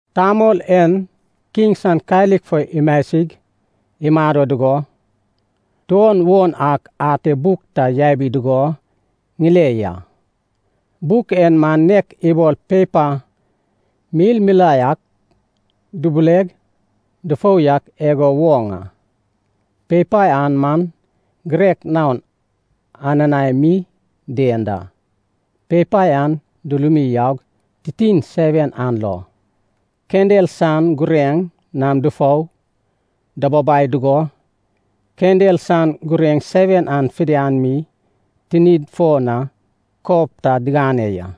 Tamol en kiŋ san kalik fo imasig imado dugo, tuon won ak ate buk ta yabi dugo ŋile ya. Buk en man nek ibol pepa milmilae ak dubuleg dufou yak igo woŋ a. Pepa an man girek naon ananae mi dien da. Pepa an dulumi yaug titin seven an lo, kendel san gureŋ nam dufou dababai dugo kendel san gureŋ seven an fidian mi tinid fo na kob ta digane ya.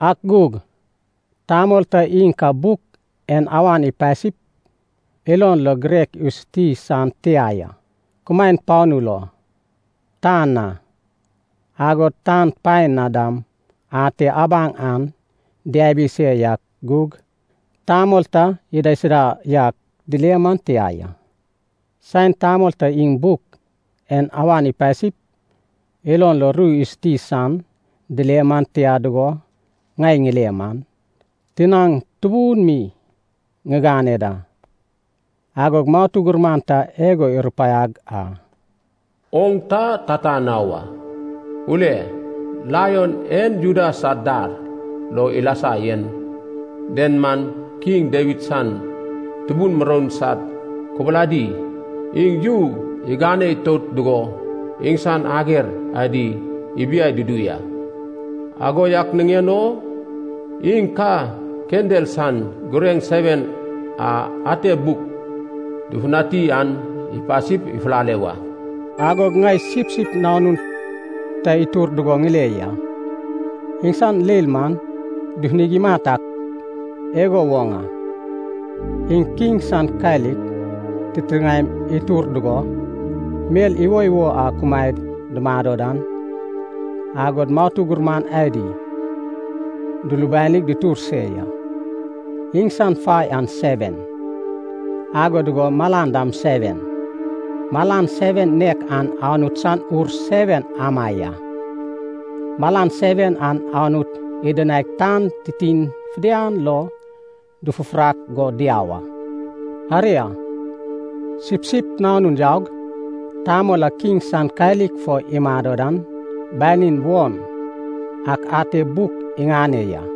Ak gug tamol ta iŋ ka buk en awan ipasip, ilon lo girek isuti san tia ya. Kumaen panu lo, tan na, agod tan paen na dam ate abaŋ an diabi se yak gug tamol ta idaisuda yak dile man tia ya. Saen tamol ta iŋ buk en awan ipasip, ilon lo ru isuti san dile man tia dugo ŋai ŋile man, tinaŋ tubun mi ŋigane da. Agog matu gurman ta igo irupaiag a, “Oŋ ta tata na wa. Ule, Laion e Juda san dar lo ilasag yen den man, kiŋ Dawid san tubun muroun sad kubuladi, iŋ yu igane itout dugo iŋsan ager adi ibiai dudu ya. Ago yak niŋen o iŋ ka kendel san gureŋ seven a ate buk dufutani an ipasip ifulale wa.” Agog ŋai Sipsip Nanun ta itur dugo ŋile ya. Iŋsan leil man dufunig imat ak igo woŋ a. Iŋ kiŋ san kalik titiŋaem itur dugo, mel iwoiwo a kumaed dumado dan, agod matu gurman adi dulubanig dutur se ya. Iŋsan fai an seven, ago dugo malan dam seven. Malan seven nek an Anut san Ur seven ama ya. Malan seven an Anut idinaig tan titin fidian lo dufufurak go diau a. Aria, Sipsip Nanun yaug Tamol a kiŋ san kalik fo imado dan banin won ak ate buk iŋane ya.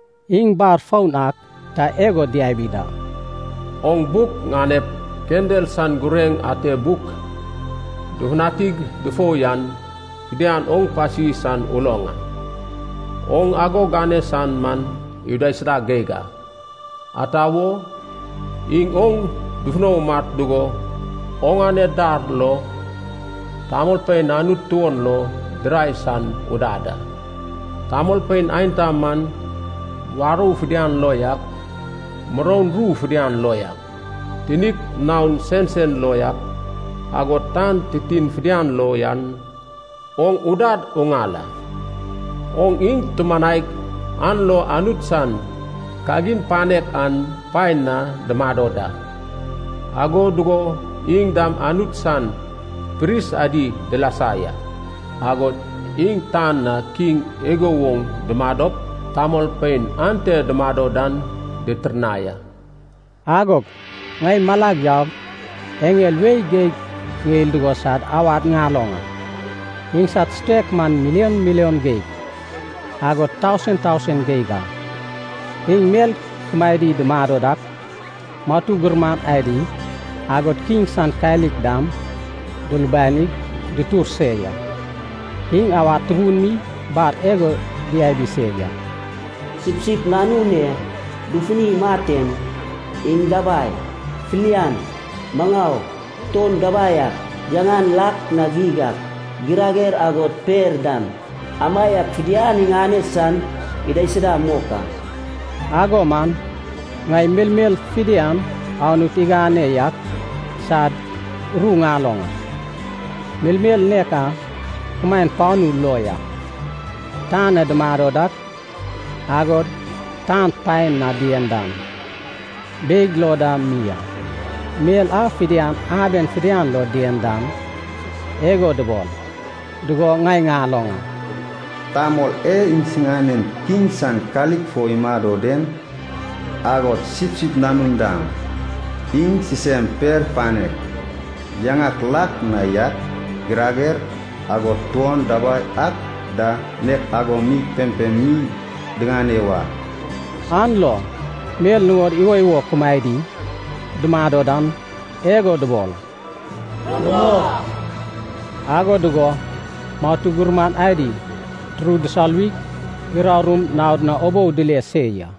Iŋ bar foun ak ta igo diabi da, “Oŋ buk ŋanep kendel san gureŋ ate buk dufutanig dufou yan fidian oŋ pasi san uloŋ a. Oŋ ago gane san man idaisuda geig a. Ata wo, iŋ oŋ dufuno umat dugo, oŋane dar lo tamolpein Anut tuon lo dirai san udad a. Tamolpein aenta man, warou fidian lo yak, muroun ru fidian lo yak, tinik naon sensen lo yak, agod tan titin fidian lo yan oŋ udad uŋal a. Oŋ iŋ tumanaig an lo Anut san kagin panek an paen na dumado da, ago dugo iŋ dam Anut san pris adi dilasa ya. Agod iŋ tan na kiŋ igo woŋ dumadop tamolpein ante dumado dan ditirnai a.” Agog ŋai malag yaug eŋel wei geig ŋeil dugo sad awad ŋaloŋ a. Iŋsad sutek man milion milion geig agod tausen tausen geig a. Iŋ mel kumaedi dumado dak, matu gurman adi, agod kiŋ san kalik dam dulubanig dutur se ya. Iŋ awad tubun mi bar igo diabi se ya, “Sipsip Nanun e dufuni imat en, iŋ dabai, filian, maŋau, tuon dabai ak, yaŋan lak na geig ak, girager agod per dam, amaiak fidian iŋane san idaisuda mok a.” Ago man ŋai melmel fidian Anut igane yak sad ru ŋaloŋ a, melmel nek a kumaen panu lo yak, tan na dumado dak, agod tan paen na dien dan, beig lo da mi a. Mel a fidian aben fidian lo dien dan, igo dubol dugo ŋai ŋaloŋ a. “Tamol e iŋsinan kiŋ san kalik fo imado den, agod Sipsip Nanun dam, iŋ sisem per panek, yaŋak lak na yak, girager, agod tuon dabai ak da nek ago mi pempem mi diŋane wa.” An lo mel nuŋod iwoiwo kumaedi dumado dan, igo dubol, “Rumok!” Ago dugo matu gurman adi turud dusoluwig, urarum naod na ubou dile se ya.